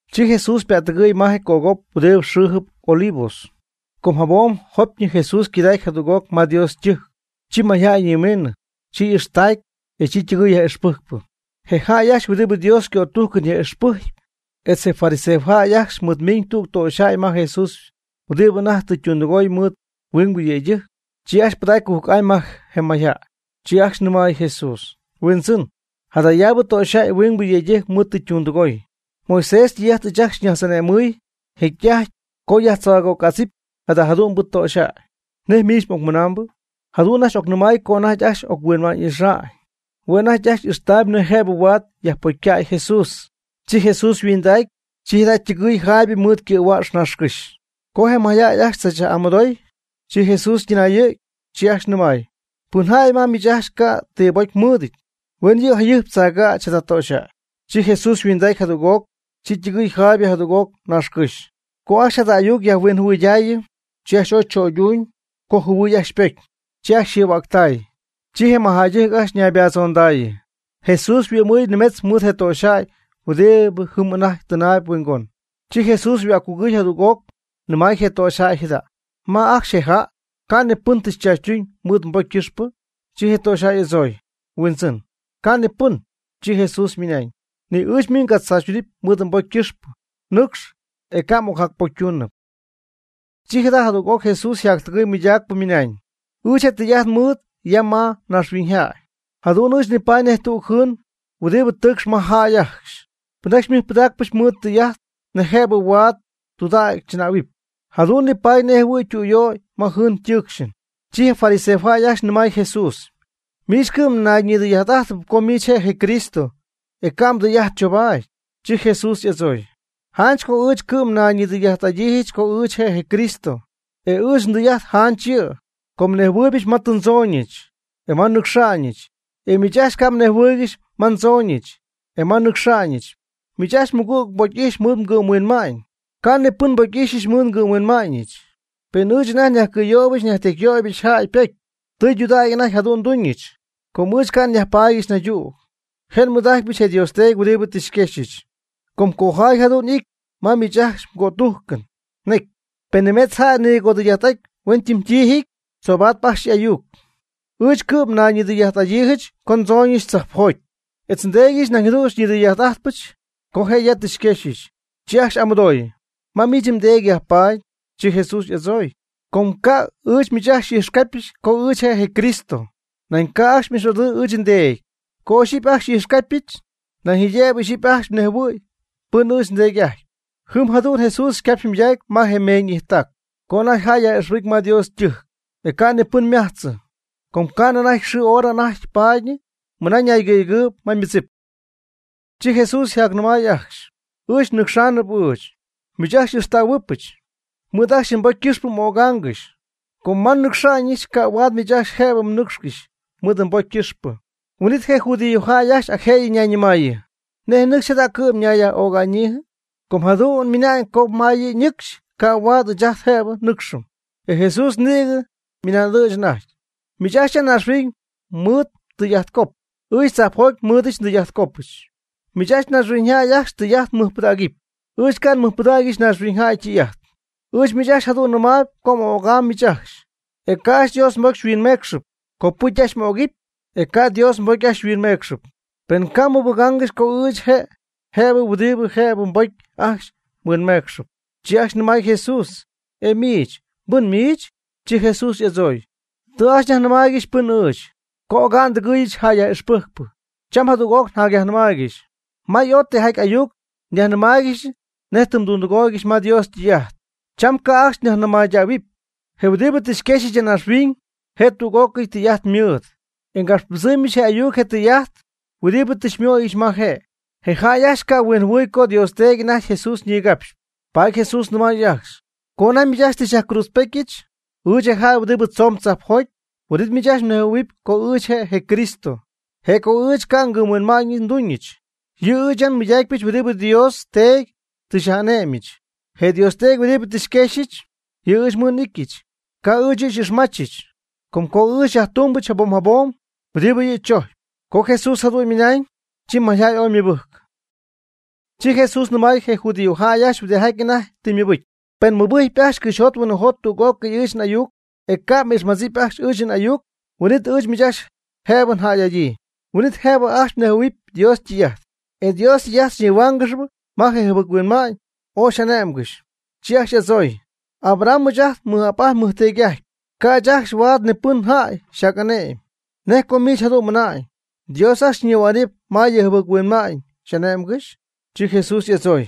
Chi Jesús ypa'ttɨgɨɨy ma je cögop huɨdibɨ xɨɨjɨp Olivos. Com jabom jopyñɨ Jesús yquidacy jadüg'oc ma Dios ytɨjc. Chi mayjäy ñimiinɨ. Chi y'ixtacy, e chi ytɨgɨɨy yaj'ixpɨjcpɨ. Je jäy ajcxy huɨdibɨ Dios ycötujcɨn yaj'ixpɨjcp etz je fariseojäy ajcxy mɨɨdmiiñ tüg töxyjäy ma Jesús huɨdibɨ anajty tɨ ytundɨgooy mɨɨd huingbɨ yëydɨjc. Chi ajcxy pɨdacy cujc'amy ma je mayjäy. Chi ajcxy nɨmay Jesús: ―Huindzɨn, jadayaabɨ töxyjäy huingbɨ yëydɨjc mɨɨd tɨ ytundɨgoy. Moisés ytɨy'ajt ɨɨch ajcxy xyñajtz'ane'mɨy jecy'ajty co yajtzaagögädzɨpy jada jadu'mbɨ töxyjäy. ¿Nej miich m'ocmɨnambɨ? Jadu'n ajcxy nɨmay co anajty ajcxy oc-huinma'ñ'ixa'ñ. Hue' anajty ajcxy ixtaayb nej jëbɨ huaad yajpocycäy Jesús. Chi Jesús yhuindacy, chi jada' ytɨgɨɨy jaaybɨ mɨɨd ycɨ̈huäx naaxcɨ́xy. Com je' anajty ajcxy chachyaj'amɨdooyb, chi Jesús ytɨnayɨ̈gy. Chi ajcxy nɨmay: ―Pɨn jäy ji ma miich ajcxy ca' ti pocy mɨɨdɨty, huen yɨ' jayɨjp tzaagäch jada töxyjäy. Chi Jesús yhuindacy jadüg'oc. Chi ytɨgɨɨy jaaybɨ jadüg'oc naaxcɨ́xy. Co ajcxy jadu'n ayuc yajhuinjɨhuɨydaayɨ, chi ajcxy ooy chöyduñ, com yjɨhuɨy ajcxy ypocy. Chi ajcxy yjɨhuäctay. Chi je mɨjjäydɨjc ajcxy ñaybattzondayɨ. Jesús yhuɨ'mɨɨy nimetz mɨɨd je töxyjäy huɨdibɨ jɨm anajty tɨnaayb huingon. Chi Jesús yhuäccugɨy jadüg'oc nɨmay je töxyjäy jada': ―¿Ma ajcxy je jäy? ¿Ca' ni pɨn tɨ xychaachytuñ mɨɨd mbocy ycɨxpɨ? Chi je töxyjäy y'adzooy: ―Huindzɨn, ca' ni pɨn. Chi Jesús ymɨnañ: ―Ni ɨɨch miich ngatzaachytunɨpy mɨɨd mbocy ycɨxpɨ. Nɨcx, e ca' m'ocjacpocytuunɨp. Chi jadüg'oc Jesús yjactɨgɨy mɨydacp ymɨnañ: ―Ɨɨch je tɨy'ajt nmɨɨd ya ma naaxhuiñyjäy, jadu'n ɨɨch nipaady nej tüg jɨɨn huɨdibɨ tɨɨcxp ma jäy ajcxy. Pɨnjäy xymɨjpɨdaacpɨch ymɨɨd tɨy'ajt nej jëbɨ huaad tudägy chɨnähuɨpy, jadu'n nipaady nej jɨhuɨ̈y ytüyöy ma jɨɨn ytɨɨcxɨn. Chi je fariseojäy ajcxy nɨmay Jesús: ―Miich cɨ'm nayñidɨy'ajtɨp co miich je' je Cristo, e ca' mdɨy'ajt chobaady. Chi Jesús y'adzooy: ―Janch co ɨɨch cɨ'm nayñidɨy'ajt'adyiijɨch co ɨɨch je' je Cristo. E ɨɨch ndɨy'ajt janch yɨ'. Com nnejhuɨɨybɨch ma tɨ ndzooñɨch, e ma nnɨcxa'ñɨch. E miich ajcxy ca' mnejhuɨɨygɨxy ma ndzooñɨch, e ma nnɨcxa'ñɨch. Miich ajcxy mmɨgüg mbocy'ijxyp mɨɨd mgɨ'mhuinma'ñ. Ca' ni pɨn nbocy'ixyɨch mɨɨd ngɨ'mhuinma'ñɨch. Pen ɨɨch anajty nyajcɨ̈yöybɨch nyajtecyyöybɨch jäy ypocy, tɨydudägy anajty jadu'n nduñɨch. Com ɨɨch ca' nyajpaadyɨch naydüg. Je' xymɨɨd'ijtpɨch je Dios Teedy huɨdibɨ tɨ xyquexyɨch. Com cojaay jadu'n y'ity ma miich ajcxy mgötujcɨn ñecy: “Pen nimetz jäy nigodɨy'ajt'aty huentiijɨty, tzoobatp ajcxy y'ayuc.” Ɨɨch cɨ'm ñayñidɨy'ajt'adyiijɨch co ndzooñɨch tzajpjoty, etz nDeedyɨch nañ jadu'n xyñidɨy'ajt'ajtpɨch, co je' ya tɨ xyquexyɨch. Chi ajcxy y'amɨdooy: ―¿Ma miich mdeedy yajpaady? Chi Jesús y'adzooy: ―Com co ca' ɨɨch miich ajcxy xy'ijxcapy co ɨɨch je' je Cristo, nañ ca' ajcxy m'ixy'adyii ɨɨch nDeedy. Co ixyipy ajcxy xy'ijxcapyɨch, nañ jaydëbɨ ixyipy ajcxy nejhuɨ̈y pɨn ɨɨch nDeedy'ajtyp. Jɨm jadu'n Jesús ycapxy ymɨydacy ma je meeñ'ijttac, co anajty yjäy yaj'ixpɨcy ma Dios ytɨjc. E ca' ni pɨn ymajtzɨ. Com ca'nɨ anajty yxɨɨ yhora anajty paadyñɨ mɨna ñaygɨ̈yegɨɨyb ma ymɨdzip. Chi Jesús yjacnɨmaayɨ ajcxy: ―Ɨɨch nnɨcxaanɨp ɨɨch, miich ajcxy xy'ixtähuɨbɨch. Mɨɨd ajcxy mbocy ycɨxpɨ m'ögaangɨxy, com ma nnɨcxa'ñɨch ca' huaad miich ajcxy jëbɨ mnɨcxcɨxy mɨɨd mbocy ycɨxpɨ. Huin'it je judíojäy ajcxy ac jëyɨ ñayñɨmaayɨ: ―¿Nej nɨcxy jada' cɨ'm ñayyaj'öga'ñyiijɨ? Com jadu'n ymɨna'ñ co ma yɨ' ñɨcxy, ca' huaad ɨɨch ajt jëbɨ nnɨcxɨm. E Jesús nïgɨ nɨmay'ɨdɨ̈ch anajty: ―Miich ajcxy ya naaxhuiñ mmɨɨdɨty mdɨy'ajtcop. Ɨɨch tzajpjoty nmɨɨdɨdyɨch ndɨy'ajtcopɨch. Miich ajcxy naaxhuiñyjäy ajcxy ytɨy'ajt mmɨjpɨdaacɨpy. Ɨɨch ca' nmɨjpɨdägyɨch naaxhuiñyjäy ytɨy'ajt. Ɨɨch miich ajcxy jadu'n nnɨmaayb co m'ögam miich ajcxy, e ca' ajcxy Dios mbocy xyhuinmeecxɨp. Copɨcy ajcxy m'ögɨpy, e ca' Dios mbocy ajcxy xyhuinmeecxɨp, pen ca' xymɨbɨgáangɨxyɨch co ɨɨch je' je huɨdibɨ jëbɨ mbocy ajcxy xyhuinmeecxɨp. Chi ajcxy nɨmay Jesús: ―¿E miich, pɨn miich? Chi Jesús y'adzooy: ―Tɨ ajcxy nyajnɨmaaygɨxy pɨn ɨɨch, co oga'n ndɨgɨɨyɨch jäy yaj'ixpɨjcpɨ. Cham jadüg'oc nyajnɨmaaygɨxy. May ooy tijaty ayuc nyajnɨmähuaangɨxy nej tɨ mdundɨgooygɨxy ma Dios ytɨy'ajt. Cham ca' ajcxy nyajnɨmaydähuɨpy. Je huɨdibɨ tɨ xyquexyɨch ya naaxhuiñ je' tüg'ócɨy tɨy'ajt mɨɨd. E ngapxpɨdzɨmyɨch je ayuc je tɨy'ajt jëyɨ huɨdibɨ tɨ nmɨdooyɨch ma je'. Je jäy ca' ajcxy huinjɨhuɨy co Dios Teedy anajty Jesús ñigapxyp. Paady Jesús nɨmay ajcxy: ―Co anajty miich ajcxy tɨ xyajcruudzpetyɨch, ɨɨch je jäy huɨdibɨ tzoon tzajpjoty, huin'it miich ajcxy mnejhuɨ̈huɨp co ɨɨch je' je Cristo. E co ɨɨch ca' ngɨ'mhuinma'ñ nduñɨch. Yɨ' ɨɨch ya nmɨydacypɨch huɨdibɨ Dios Teedy tɨ xyaj'ane'myɨch. Je Dios Teedy huɨdibɨ tɨ xyquexyɨch, yɨ' ɨɨch mɨɨd n'ityɨch. Ca' ɨɨch yɨ' xy'ixmachɨch. Com co ɨɨch njatytɨmytumybɨch jabom jabom huɨdibɨ yɨ' chojcyp. Co Jesús jadu'n ymɨnañ, chi mayjäy ooy ymɨbɨjcy. Chi Jesús nɨmay je judíojäy ajcxy huɨdijaty anajty tɨ ymɨbɨcy: ―Pen mmɨbɨjc ajcxy cɨxyjot huinɨjot tüg'ócɨy ɨɨch n'ayuc, e ca' m'ijxmadzipy ajcxy ɨɨch n'ayuc, huin'it ɨɨch miich ajcxy jëbɨ njäy'adyii. Huin'it jëbɨ ajcxy mnejhuɨ̈huɨpy Dios ytɨy'ajt. E. Dios ytɨy'ajt xyñihuáangɨxɨp ma je mjɨbɨc-huinma'ñ ooy xy'ané'mgɨxy. Chi ajcxy y'adzooy: ―Abraham ɨɨch ajcxy nmɨj'ap nmɨjteedy'ajtpy. Ca' ɨɨch ajcxy huaad ni pɨnjäy xyjac'ane'my. ¿Nej co miich jadu'n mɨna'ñ: “Dios ajcxy xyñihua'nɨp ma yɨ mjɨbɨc-huinma'ñ xy'ane'mgɨxy”? Chi Jesús y'adzooy: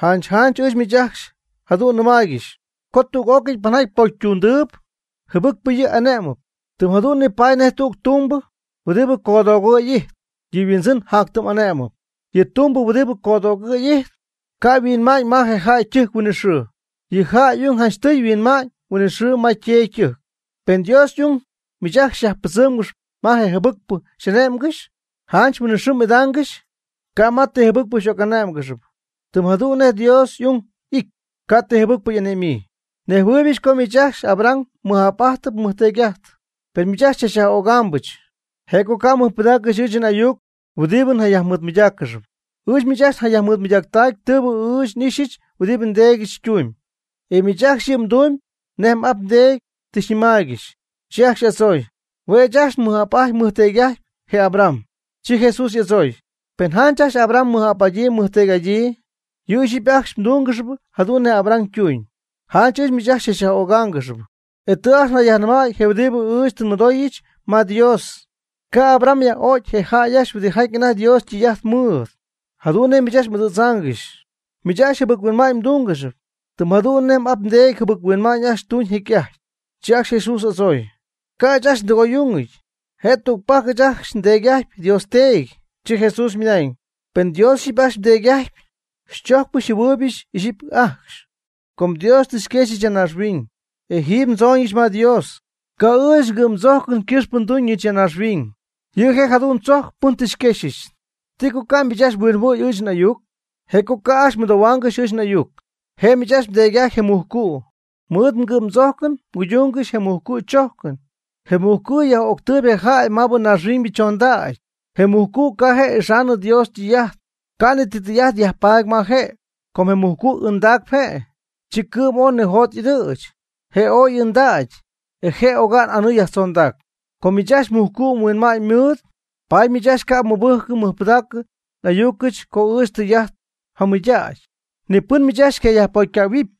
―Janch janch ɨɨch miich ajcxy jadu'n nɨmaaygɨxy co tüg'ócɨy pɨnjaty pocy ytundɨɨb, jɨbɨcp yɨ' ane'mɨp. Tɨm jadu'n nipaady nej tüg tumbɨ huɨdi codoogɨ̈ y ijtp, yɨ' yhuindzɨn jatytɨmy'ane'mɨp. Yɨ tumbɨ huɨdibɨ codoogɨ̈y ijtp, ca' yhuɨ'ma'ñ ma je jäy ytɨjc huinɨxɨɨ. Yɨ jäy y'ung janchtɨy huɨ'mam huinɨxɨɨ ma yteedy ytɨjc. Pen Dios y'ung miich ajcxy xyajpɨdzɨmgɨxp ma je jɨbɨcpɨ xy'ane'mgɨxy, janch huinɨxɨɨ m'idaangɨxy, ca' ma ti jɨbɨcpɨ xy'oc'ané'mgɨxnɨpy. Tɨm jadu'n nej Dios y'ung y'ity, ca' ti jɨbɨcpɨ y'ane'myii. Nejhuɨɨybɨch co miich ajcxy Abraham mmɨj'ap'adyii mmɨjteedy'adyii. Per miich ajcxy chachyaj'ögaambɨch. Je' co ca' mɨjpɨdaaccɨxy ɨɨch n'ayuc huɨdibɨ njayajnɨmaaygɨxyp. Ɨɨch miich ajcxy nyajmɨɨdmɨydaacyp tɨɨbɨ n'ixyɨch huɨdibɨ ndeedyɨch ytumyb. E miich ajcxy yɨ' mdumyb nej m'ap mdeedy tɨ xyajnɨmaaygɨxy. Chi ajcxy y'adzooy: ―Hue' ɨɨch ajcxy nmɨj'ap'ajtyp nmɨjteedy'ajtyp je Abraham. Chi Jesús y'adzooy: ―Pen janch ajcxy Abraham mmɨj'ap'adyii mmɨjteedy'adyii, yɨ' ixyipy ajcxy mdungɨxyp jadu'n nej Abraham tuuñ. Janch ɨɨch miich ajcxy xychachyaj'ögáangɨxyɨch, e tɨ ajcxy njayajnɨmäy je huɨdibɨ ɨɨch tɨ nmɨdooyɨch ma Dios. Ca' Abraham yaj'ögy je jäy ajcxy huɨdijaty anajty Dios ytɨy'ajt mɨɨd, jadu'n nej miich ajcxy m'ɨdɨ̈tzaangɨxy. Miich ajcxy jɨbɨc-huinma'ñ mdungɨxyp, tɨm jadu'n nej m'ap mdeedy jɨbɨc huinma'ñ ajcxy tuñ jecy'ajty. Chi ajcxy Jesús adzooy: ―Ca'ɨɨch ajcxy ndɨgoy'ungɨty. Je' tügpajc ɨɨch ajcxy ndeedy'ajtyp Dios Teedy. Chi Jesús ymɨnañ: ―Penɨ Dios ixyipy ajcxy mdeedy'ajtyp, xychojcpɨch xymɨjpɨdaacpɨch ixyipy ajcxy. Com Dios tɨ xyquexyɨch ya naaxhuiñ, e jiiby ndzooñɨch ma Dios. Ca'ɨɨch ngɨ'mdzojcɨn ycɨxpɨ nmiiñɨch ya naaxhuiñ. Yɨ' je' jadu'n tzojcp pɨn tɨ xyquexyɨch. ¿Ti co ca' miich ajcxy mhuinjɨhuɨ̈y ɨɨch n'ayuc? Je' co ca' ajcxy mɨdohuaangɨxy ɨɨch n'ayuc. Je' miich ajcxy mdeedy'ajtyp je mujcu'. Mɨɨd mgɨ'mdzojcɨn mguydungɨxy je mujcu' chójcɨn. Je mujcu'yaj'öctɨɨyb yɨ' jäy maabɨ naaxhuiñybɨ chondägy. Je mujcu' ca' je' ixaanɨ Dios ytɨy'ajt. Ca' ni ti tɨy'ajt yajpaady ma je', com je mujcu' ɨndaacp je', chi cɨ'm ooy nijot y'ɨdɨ̈ch. Je' ooy ɨndacy, e je' oga'n anɨɨ yajtzondac. Com miich ajcxy mujcu' yhuinma'ñ mɨɨd, paady miich ajcxy ca' xymɨbɨjcɨ xymɨjpɨdaacɨ n'ayucɨch co ɨɨch tɨy'ajt njamɨydägy. Ni pɨn miich ajcxy xycayajpocycähuɨpy.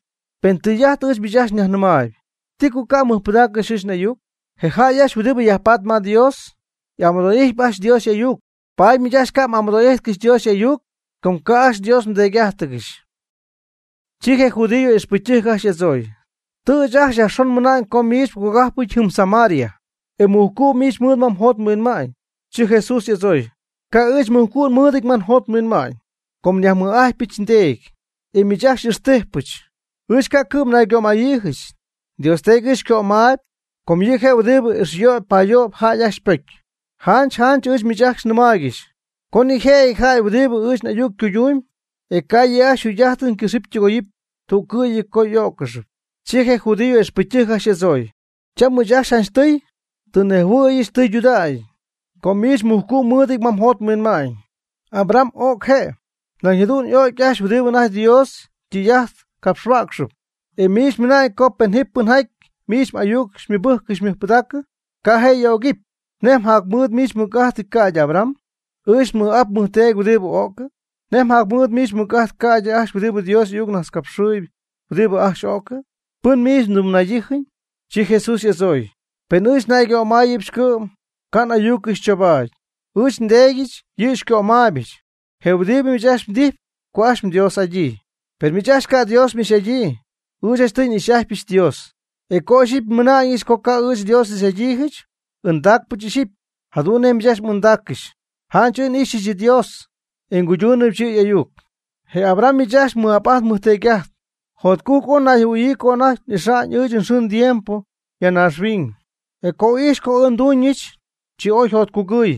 Penɨ tɨy'ajt ɨɨch miich ajcxy nyajnɨmaayb, ¿ti co ca' mmɨjpɨdaaccɨxy ɨɨch n'ayuc? Je jäy ajcxy huɨdibɨ yajpatp ma Dios, y'amɨdo'ijtyp ajcxy Dios y'ayuc. Paady miich ajcxy ca' m'amɨdo'ijtcɨxy Dios y'ayuc, com ca' ajcxy Dios mDeedy'ájtɨgɨxy. Chi je judío ixpɨcytɨjc ajcxy y'adzooy: ―Tɨ ɨɨch ajcxy yajxon nmɨna'ñ co miich mgogajpɨty jɨm Samaria, e mujcu' miich mɨɨd ma mjot mhuinma'ñ. Chi Jesús y'adzooy: ―Ca' ɨɨch mujcu' nmɨɨdɨty ma njot nhuinma'ñ, com nyajmɨj'ajtypɨch nDeedy, e miich ajcxy xy'ixtijpɨch. Ɨɨch ca' cɨ'm naygömayiijɨch. Dios Teedy ɨɨch xycömaayb, com yɨ' je' huɨdibɨ ixyöyp payöyp jäy ajcxy ypocy. Janch janch ɨɨch miich ajcxy nɨmaaygɨxy co ji nijëjɨty jäy huɨdibɨ ɨɨch n'ayuc cuydumb, e ca' yɨ' ajcxy yjugy'ajtɨn ycɨxɨpy ytɨgoyɨpy tüccɨ'yɨ co y'ó'ccɨxɨpy. Chi je judío ixpɨcytɨjc ajcxy y'adzooy: ―Cham ɨɨch ajcxy janchtɨy tɨ nnejhuɨ̈yɨch tɨydudägy co miich mujcu' mɨɨdɨty ma mjot mhuinma'ñ. Abraham o'c je', nañ jadu'n o'c ajcxy je huɨdibɨ anajty Dios ytɨy'ajt capxhuäcxɨp, e miich mmɨna'ñ co pen ji pɨnjaty miich m'ayuc xymɨbɨjcɨp xymɨjpɨdaacɨp, ca' je' y'ögɨpy. ¿Nej mjacmɨɨd miich mɨc'ajt, ca'ydɨ Abraham, ɨɨch ajt nmɨj'ap nmɨjteedy huɨdibɨ o'cɨ? ¿Nej mjacmɨɨd miich mɨc'ajt, ca'ydɨ ajcxy huɨdibɨ Dios y'ayucnajtzcapxɨɨy, huɨdibɨ ajcxy o'cɨ? ¿Pɨn miich mdɨmnaydijyii? Chi Jesús y'adzooy: ―Pen ɨɨch nnaygömayɨbɨch cɨ'm, ca' n'ayucɨch chobaadɨpy. Ɨɨch nDeedy yɨ' xycömayɨpɨch, je huɨdibɨ miich ajcxy mdijpy co ajcxy mDios'adyii. Per miich ajcxy ca' Dios m'ixy'adyii. Ɨɨch janchtɨy n'ixy'ajtypɨch Dios. E co ixyipy nmɨna'ñɨch co ca' ɨɨch Dios n'ixy'adyii, ɨndaacpɨch ixyipy, jadu'n nej miich ajcxy m'ɨndaaccɨxy. Janch ɨɨch n'ixyɨch Dios, e nguydumybɨch yɨ' y'ayuc. Je Abraham, miich ajcxy mmɨj'ap mmɨjteedy, jotcujc ooy ñayjɨhuɨɨyɨ co anajty ixa'ñ ɨɨch nxɨɨ ndiempo ya naaxhuiñ. E co ijxy co ɨɨch nmiiñɨch, chi ooy yjotcugɨɨy.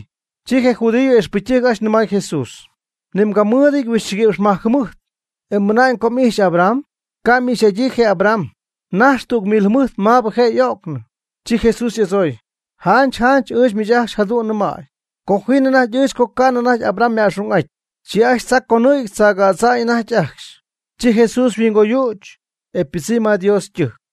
Chi je judío ixpɨcytɨjc ajcxy nɨmay Jesús: ―Ni mgamɨɨdɨty huixchigui'px majc jɨmɨjt, e ¿mmɨna'ñ co m'ijxy Abraham? (Ca' m'ixy'ajtɨ je Abraham, naxy tüg mil jɨmɨjt maabɨ je' y'o'cnɨ.) Chi Jesús y'adzooy: ―Janch janch ɨɨch miich ajcxy jadu'n nɨmäy co ji anajty ɨɨch co ca'nɨ anajty Abraham yma'xung'aty. Chi ajcxy tzaa conɨ̈gy tzaagädza'ñ anajty ajcxy. Chi Jesús yhuingoyüch, e ypɨdzɨmy ma Dios ytɨjc.